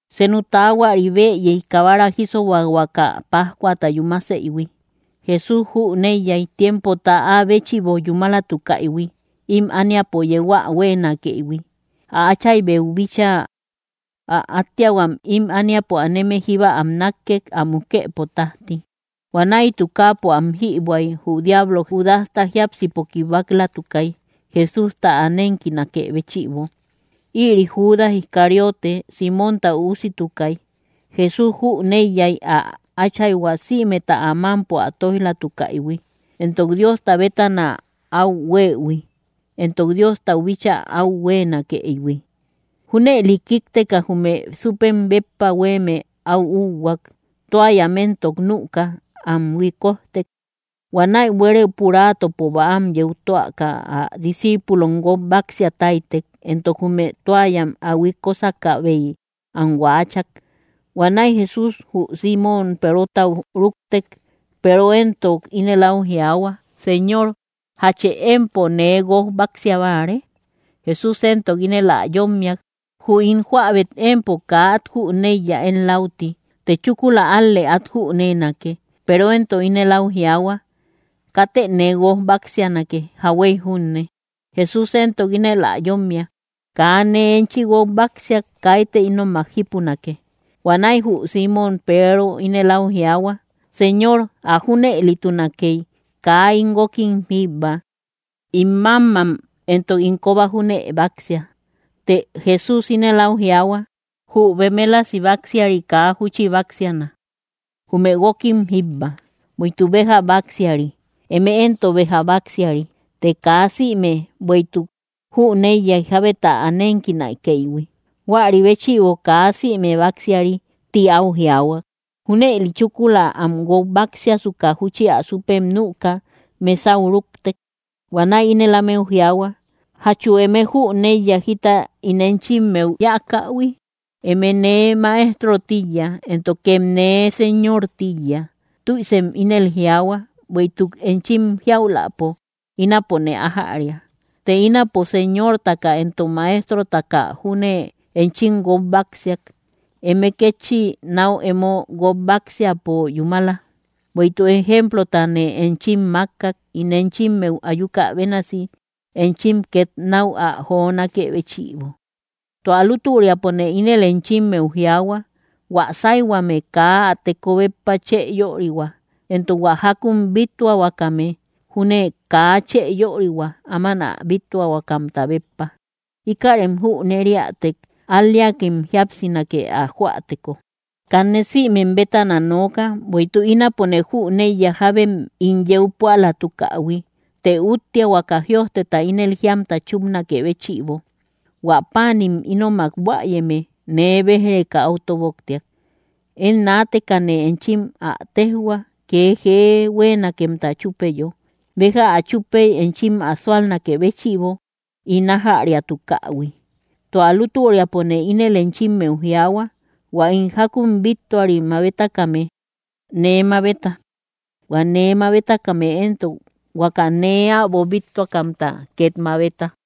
Senu taahuari bëyey, kabara jísobahuaka pájcuata yúmaseïhui. Jesús jüneiyay, tiempota áa béchïbo yúmalatukaïhui ím ániapo yeu ä huéenakëihui, ä Áchaybeu bíchaa. Ä átteahuam ím ániapo aneme jíba am nákkek, ä mukëpo tájti. Huanäi tukaapo am jïbuäy, jü diablo Judasta jiápsipo kibak‑latukay, Jesústa ä nénkinakë béchïbo. Ïri Judas Iscariote, Símonta üusitukay. Jesús jüneiyay ä Áchayhua sïmeta ä mámpo ä tóij‑latukaïhui, éntok Diosta bétana áu hueïhui, éntok Diostau bíchaa áu huéenakëihui. Júnëli kíkteka, jume súppem béppa huéeme áu úhuak. Toallam éntok nüka, am huikojtek. Huanäi buere puraatopo bäam yeu töaka ä discíipulom guók báksia táytek, éntok jume toallam ä huikosakäbey am huaachak. Huanäi Jesús jü Símon Perotau rúktek; Peero éntok ínel áu jiaahua: —Señor, ¿jache empo nee guók báksia báare? Jesús éntok ínel ä yómmiak: —Jü ín jóäbet empo kaa át jüneiya én läuti; të chúkula ál‑lë át jüneenake. Peero éntok ínel áu jiaahua: —Katë nee guók báksianake, jauhuey junne. Jesús éntok ínel ä yómmiak: —Kaa nee enchi guók báksiak, kaitë ínomak jípunake. Huanäi jü Símon Peero ínel áu jiaahua: —Señor, ä junëlitunakey, kaa ín guókim jíbba, ín mámmam éntok ín kóba júne báksia. Të Jesús ínel áu jiaahua: —Jü bemélasi baksiari kaa júchi báksiana, jume guókim jíbba, bueïtuk béja baksiari. Eme éntok béja báksiari, të kaa sïme. Bueïtuk jüneiyay jábeta ä nénkinakëihui; huäri béchïbo: “Kaa sïme báksiari”, ti áu jiaahuak. Júnëli, chúkula am guók báksiasuka, júchi ä súppem nüka, mesau rúktek. Huanäi ínel ámeu jiaahua: —¿Jachu eme jüneiya jita ín enchimmeu yáakähui? Eme nee Maeströ tíiya, éntokem nee Señor tíiya. Tüisem ínel jiaahua, bueïtuk enchim jiauläpo, ínapone ájäria. Të ínapo Señortaka éntok Maestrotaka júne enchim guók báksiak, eme kétchi náu emo guók báksiapo yúmala. Bueïtuk ejemplotane enchim mákkak, ín enchimmeu ayuka bénasi enchim két náu ä jonákë béchïbo. Tua lútüriapone ínel enchimmeu jiaahua: Huä sáyhuame kaa ä teko béppa chë yörihua; éntok hua jákun bíttuahuakame júne kaa chë yörihua áman ä bíttuakamta béppa. Íkärem jüneriätek, al‑leakem jíapsinake ä joäteko. ’Kanne sïmem bétana nooka. Bueïtuk ínapone jüneiya jábem ín yeu púalatukähui. Të úttea huaka jïojteta ínel jíamta chúpnakë béchïbo: “Huä páanim ínomak buäyeme nee béj‑reka áu tóboktiak.” Én naatekane enchim ä téjhua, kee jee huéenakemta chúpeyo, béja ä chúpey enchim ä súalnakë béchïbo ín ájäriatukähui. Tua lútüriapone ínel enchimmeu jiaahua: Huä ín jákun bíttuari mabetakame, nee mabeta; hua nee mabetakame éntok, huaka nee äbo bíttuakamta két mabeta.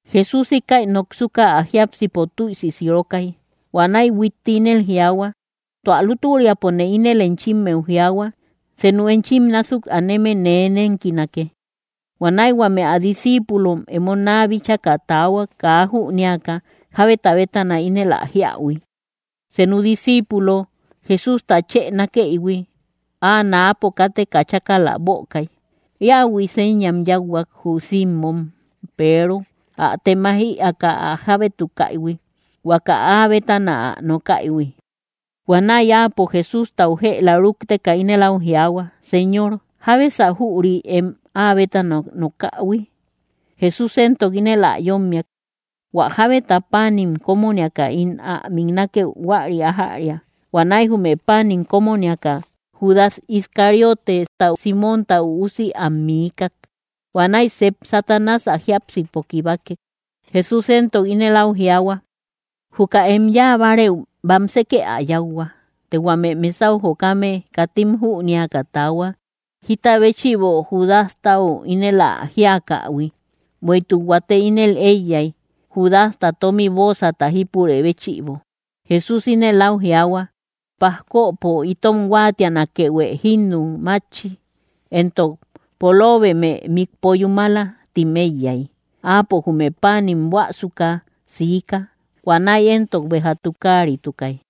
Jesús íkäi noksuka, ä jiápsipo tüisi sirokay. Huanäi huitti ínel jiaahua: —Tua lútüriapone ínel enchimmeu jiaahua, senu enchim násuk aneme nee nénkinake. Huanäi huame ä discíipulom emo naa bíchaka taahuak, kaa jünéaka jábeta bétana ínel ä jíähui. Senu disciipulo, Jesústa chë nákeïhui, áa náapo káteka chákala bökay. Íähui señam yáuhuak, jü Simmom Peero, ä temaij ïaaka ä jábétukaïhui huaka áa bétana ä nokaïhui. Huanäi áapo, Jesústau jëla rúkteka, ínel áu jiaahua: —Señor, ¿jábesa jüri em áa bétana nokähui? Jesús éntok ínel ä yómmiak: —Huä jábeta páanim kómoniaka ín ä miknakeu, huäri ájäria. Huanäi jume páanim kómoniaka, Judas Iscarioteta, Símonta üusi, am miikak. Huanäi sep Satanás ä jiápsipo kibakek. Jesús éntok ínel áu jiaahua: —Juka em yáa bárëu, bamsekë ä yáuhua. Të huame mesau jokame katim jünéaka taahuak, jita béchïbo Judastau ínel ä jíakähui. Bueïtuk huate ínel éiyay: Judasta tómi bóosata jípurë béchïbo, Jesús ínel áu jiaahua: “Pajkopo itom huáatianakeuë jínnu mátchi”, éntok: “Poloobeme mikpo yúmala”, tim éiyay. Áapo jume páanim buäsuka siika. Huanäi éntok béja tukaaritukay.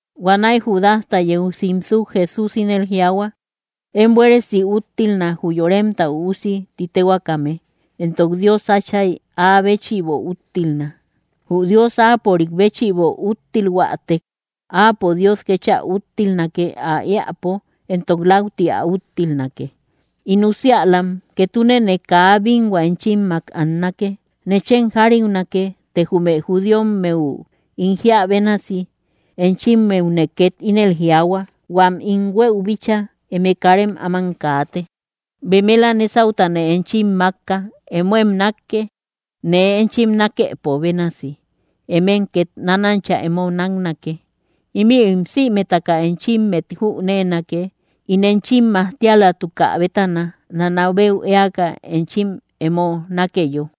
Huanäi Judasta yeu simsuk, Jesús ínel jiaahua: —Én buéresi úttilna, jü Yoremta Üusi ti téhuaakame, éntok Dios Átchay áa béchïbo úttilna. Jü Dios áapörik béchïbo úttilhuätek, áapo Dios kéchä úttilnake, ä éäpo; éntok läuti ä úttilnake. In usiälam, ketunene kaa bínhua enchimmak annake. Nechem jariunake, të jume judíommeu ín jíä bénasi, enchimmeune két ínel jiaahua: Huam ín huëu bíchaa, eme karem áman kaate. Bemela nésautane enchim mákka: Emóem nákke. Nee enchim nákëpo bénasi, emem két nánancha emo náknake. Ímïrim sïmetaka enchimmet jüneenake, ín enchim majtialatukä bétana, nanabeu éaka enchim emo nákeyo.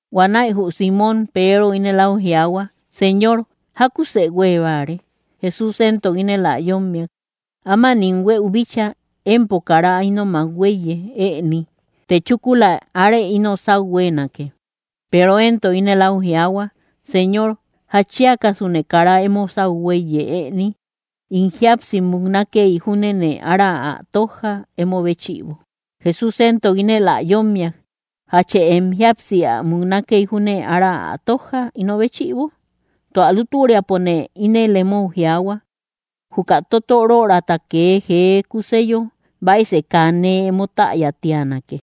Huanäi jü Símon Peero ínel áu jiaahua: —Señor, ¿jákusë huée báare? Jesús éntok ínel ä yómmiak: —Áman ín huëu bíchaa, empo kara ínomak huéiye ëni; të chúkula arë ino sáu huéenake. Peero éntok ínel áu jiaahua: —Señor, ¿jatchiakasune kara emo sáu huéiye ëni? ¡In jíapsi muknakey júnene ára ä tójja, emo béchïbo! Jesús éntok ínel ä yómmiak: —¿Jachë em jíapsi ä muknakey júne ára ä tójja, ino béchïbo? Tua lútüriapone ínel emou jiaahua, juka totorörata kee jee kuseyo, baisë kaa nee emo täya tíanake.